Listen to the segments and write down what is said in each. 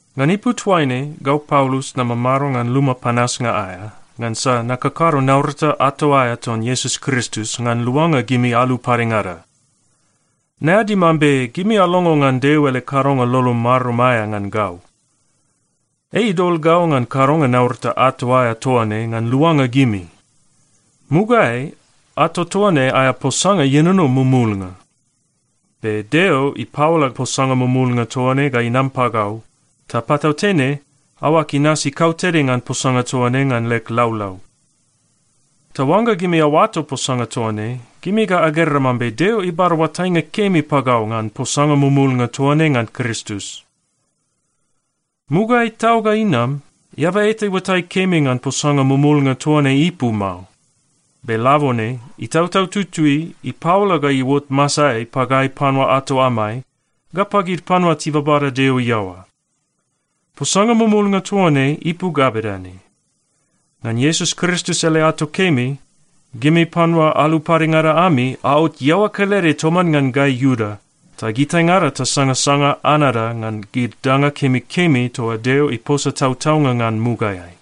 Ngan ipu toaine, gau Paulus namamado ngan luma panasnga aea, ngansa nakakado naurata ato aea ton Iesus Kristus ngan luanga gimi alu padengada. Naeadi mambe gimi alongo ngan Deo ele kadonga lolo marum aea ngan gau. Ei idol gau ngan kadonga naurata ato aea toa ne ngan luanga gimi. Mugaeai ato toa ne aea posanga ienono mumulnga. Be Deo ipaola posanga mumulnga toa ne ga inam pagau, ta patautene aoag inasi kautede ngan posanga toa ne ngan leg laulau. Ta oangga gimi aoato posanga toa ne, gimi ga agera mambe Deo ibada oatainga kemi pagau ngan posanga mumulnga toa ne ngan Kristus. Mugaeai tau ga inam, eaba eta iuatai kemi ngan posanga mumulnga toa ne ipu mao. Be labone Itautau Tutui ipaola ga iuot masaeai pagai panua ato amai ga pagid panua tibabada Deo iaoa. Posanga mumulnga toa ne ipu ga bedane: Ngan Iesus Kristus ele ato kemi, gimi panua alu padengada ami aot iaoa kelede toman ngan gai Iuda ta gitaingada tasangasanga anada ngan gid danga kemikemi toa Deo iposa tautaunga ngan mugaeai.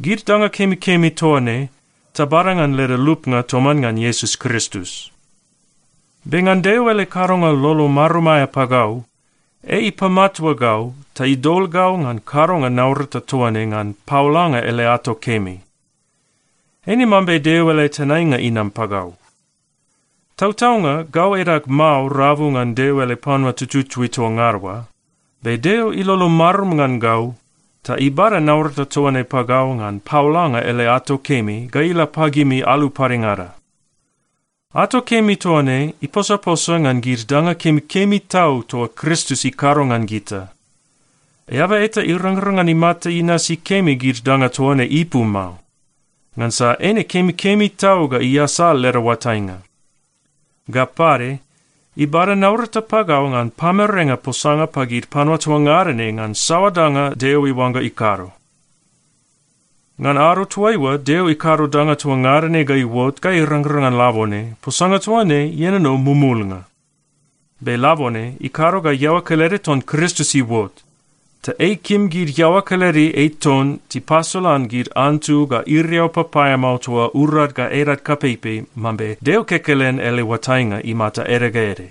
Gid danga kemikemi toa ne, tabada ngan leda lupnga toman ngan Iesus Kristus. Be ngan Deo ele kadonga lolo marum aea pagau, ei ipamatua gau ta idol gau ngan kadonga naurata toa ne ngan paolanga ele ato kemi. Eine mambe Deo ele tenainga inam pagau. Tautaunga gau edag mao rabu ngan Deo ele panua tututui toa ngada oa, be Deo ilolo marum ngan gau ta ibada naurata toa ne pagau ngan paolanga ele ato kemi ga ila pagimi alu padengada. Ato kemi toa ne iposaposa ngan gid danga kemikemi tau toa Kristus ikado ngan gita. Eaba eta irangrang ngan imata inasi kemi gid danga toa ne ipu mao, ngansa eine kemikemi tau ga iasal leda oatainga. Ga pade, ibada naurata pagau ngan pamerenga posanga pagid panua toa ngada ne ngan saoa danga Deo iuangga ikado. Ngan ado toaiua Deo ikado danga toa ngada ne ga iuot ga irangrang ngan labone, posanga toa ne ienono mumulnga. Be labone ikado ga iaoa kelede ton Kristus iuot, ta ei ikim gid iaoa kelede ei ton tipasolan gid antu ga iriau papaeamao toa urad ga edad kapeipei mambe Deo kekelen ele oatainga imata ede ga ede.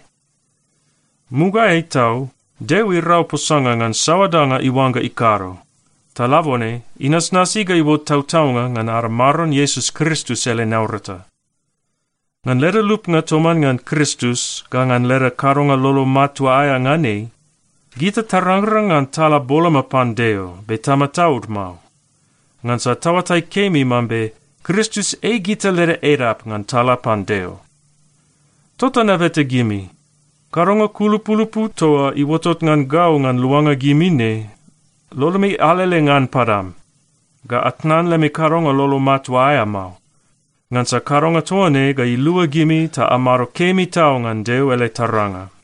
Mugaeai tau Deo irau posanga ngan saoa danga iuangga ikado, ta labone inasnasi ga iuot tautaunga ngan ada Maron Iesus Kristus ele naurata. Ngan leda lupnga toman ngan Kristus ga ngan leda kadonga lolo matua aea ngan ei, gita tarangrang ngan tala boloma pan Deo, be tamataud mao, ngansa taoatai kemi mambe Kristus ei gita leda edap ngan tala pan Deo. Tota nabeta gimi, kadonga kulupulupu toa iuotot ngan gau ngan luanga gimi ne, lolomi alele ngan padam, ga atnan lemi kadonga lolo matua aea mao. Ngansa kadonga toa ne ga ilua gimi ta amado kemi tau ngan Deo ele taranga.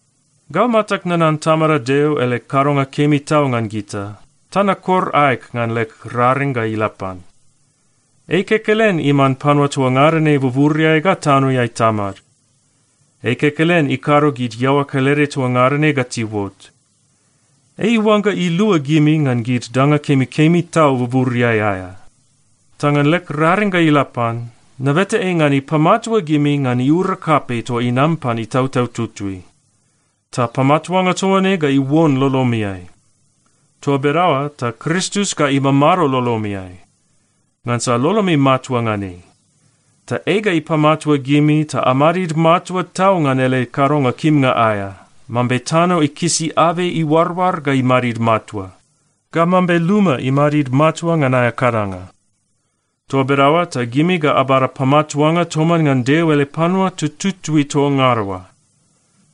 Gau matag nanan Tamada Deo ele kadonga kemi tau ngan gita, ta nakor aeg ngan leg raring ga ila pan. Ei kekelen iman panua toa ngada ne buburiai ga tanoeai Tamad. Ei kekelen ikado gid iaoa kelede toa ngada ne ga tiuot. Ei iuangga ilua gimi ngan gid danga kemikemi tau buburiai aea. Ta ngan leg raring ga ila pan, nabeta ei ngan ipamatua gimi ngan iura kapei toa inam pan Itautau Tutui. Ta pamatuanga toa ne ga iuon lolomiai. Toa bedaoa ta Kristus ga imamado lolomiai, ngansa lolomi matua ngan ei. Ta ei ga ipamatua gimi ta amadid matua tau ngan ele kadonga kimnga aea, mambe tano ikisi abei iuaroar ga imadid matua, ga mambe luma imadid matua ngan aea kadanga. Toa bedaoa ta gimi ga abada pamatuanga toman ngan Deo ele panua tututui toa ngada oa.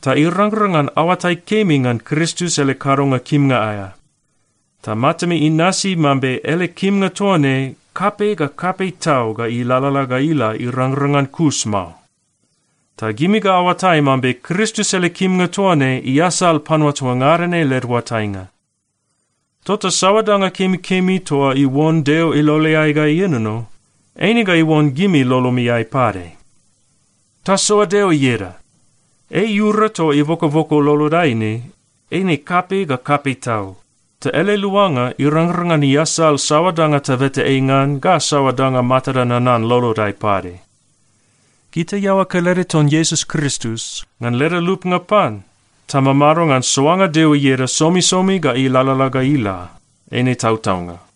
Ta irangrang ngan aoatai kemi ngan Kristus ele kadonga kimnga aea. Ta matami inasi mambe ele kimnga toa ne kapei ga kapei tau ga ilalala ga ila irangrang ngan kus mao. Ta gimi ga aoatai mambe Kristus ele kimnga toa ne iasal panua toa ngada ne led oatainga. Tota saoa danga kemikemi toa iuon Deo iloleai ga ienono, eine ga iuon gimi lolomiai pade. Tasoa Deo ieda! Ei iura toa ibokoboko lolodai ne, eine kapei ga kapei tau. Ta ele luanga irangrang ngan iasal saoa danga tabeta ei ngan ga saoa danga matada nanan lolodai pade. Gita iaoa kelede ton Iesus Kristus, ngan leda lupnga pan, tamamado ngan soanga Deo ieda somisomi ga ilalala ga ila. Eine tautaunga.